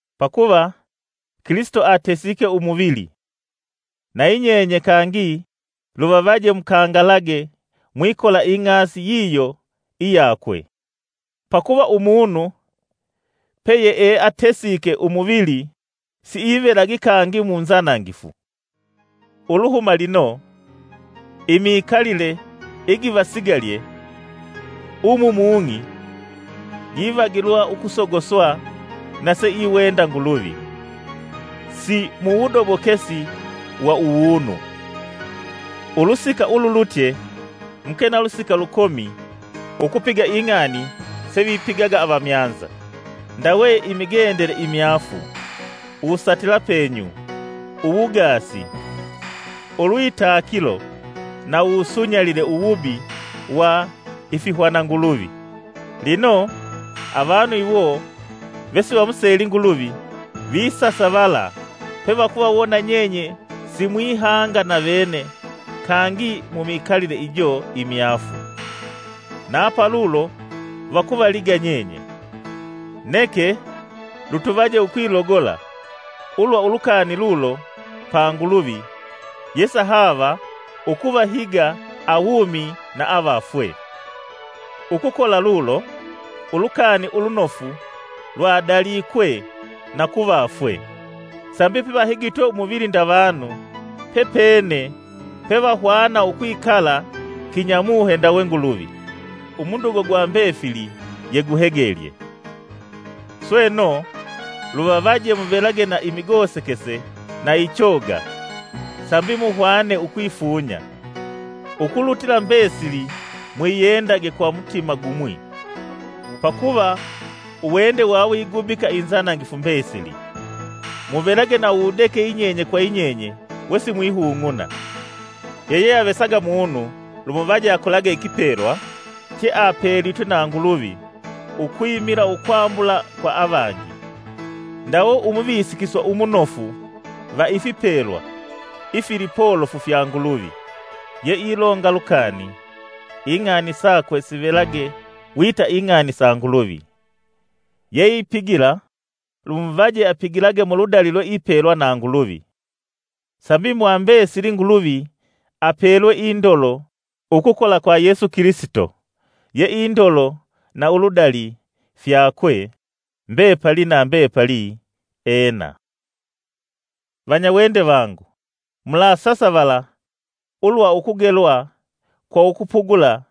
Pakuva Kilisito atesiike umuvili, nayi nyenye kangi luvavaje mukangalage mwikola ing'asi yiyo iyakwe; pakuva umunu peyeeatesike umuvili siivelagi kangi munzanangifu. Uluhuma lino, imikalile igivasigalye umu mung'i givagilwa ukusogoswa na seiwenda Nguluvi, si muwudobokesi wa uwunu. Ulusika ululutye muke na lusika lukomi ukupiga ing'ani sevipigaga avamyanza ndawe imigendele imyaafu, uwusatila penyu, uwugaasi, ulwitakilo na uwusunyalile uwubi wa ifihwananguluvi. Lino, avanu iwo vesivamuseli Nguluvi visasavala pevakuvawona nyenye simwihanga navene kangi mumikalile ijo imyaafu, na palulo vakuvaliga nyenye. Neke lutuvaje ukwilogola ulwa ulukani lulo pa Nguluvi yesahaava ukuvahiga awumi na avafwee! Ukukola lulo, Ulukani Ulunofu lwadalikwe na ku vafwee, sambi pevahigitwe umuvili nda vanu, pepene pevahwana ukwikala kinyamuhe ndawe Nguluvi. Umudugo wa mbefili yewuhegelye. Sweno luvavaje muvelage na imigosekese na ichoga, sambi muhwane ukwifunya. Ukulutila mbesili mwiyendage kwa mutima gumwi, pakuva uwende wawigubika inzanangifu mbesili. Muvelage na uwudeke yinyenye kwa yinyenye wesimwihung'una. Yeyeavesaga mumo lumuvaje akolage ikipelwa cheapelitwe na Nguluvi ukwimila ukwambula kwa avangi, ndawe umuvisikiswa umunofu va ifipelwa ifilipolofu fya Nguluvi. Yeilonga lukani, ing'ani sakwe sivelage wita ing'ani sa Nguluvi, yeipigila lumuvaje apigilage muludali lweipelwa na Nguluvi, sambi mwa mbesili Nguluvi apelwa indolo ukukola kwa Yesu Kilisito, ye indolo na uludali fyakwe mbepali na mbepali! Ena. Vanyawende vangu, mulasasavala ulwa ukugelwa kwa ukupugula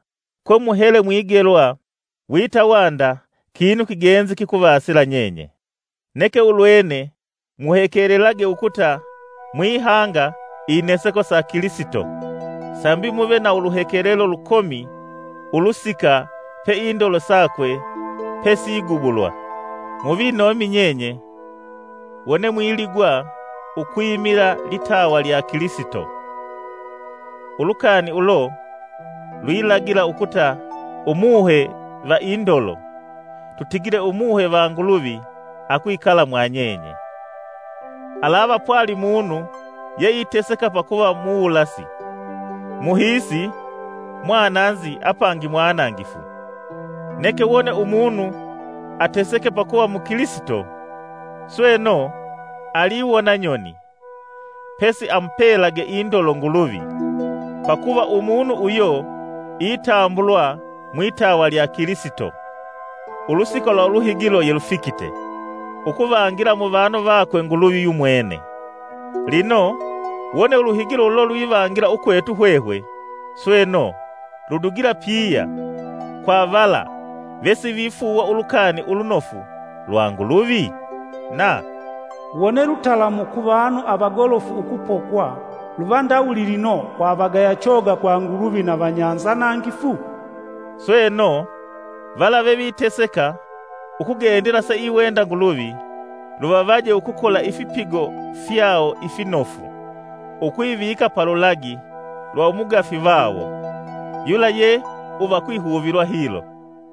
kwemuhele mwigelwa wita wanda kinu kigenzi kikuvasila nyenye. Neke ulwene muhekelelage ukuta mwihanga ineseko sa Kilisito sambi muve na uluhekelelo lukomi ulusika pe indolo sakwe pesigubulwa. Muvinomi nyenye wone mwiligwa ukwimila litawa lya Kilisito; ulukani ulo lwilagila ukuta Umuhe va indolo, tutigile Umuhe va Nguluvi akwikala mwanyenye. Alava pwali munu yeiteseka pakuva muwulasi, muhiisi, mwananzi apangi mwanangifu. Neke wone umunu ateseke pakuva mukilisito, sweno, aliwona nyoni, pesi amupelage indolo Nguluvi, pakuva umunu uyo itambulwa mwitawa lya Kilisito. Ulusika lwa uluhigilo yelufikite ukuvangila muvanu vakwe Nguluvi yumwene. Lino wone uluhigilo ulo lwivangila ukwetu hwehwe, sweno, ludugila piya kwa vala vesivifuuwa Ulukani Ulunofu lwa Nguluvi? Na “Wone lutalamu ku vanu avagolofu ukupokwa; luva ndawuli lino, kwa avagaya choga kwa Nguluvi na vanyanzanangifu?” Sweno, vala veviteseka ukugendela seiwenda Nguluvi, luvavaje ukukola ifipigo fyawo ifinofu, ukwivika pa lulagi lwa umugafi vawo yula ye uva ukwihuvilwa hilo.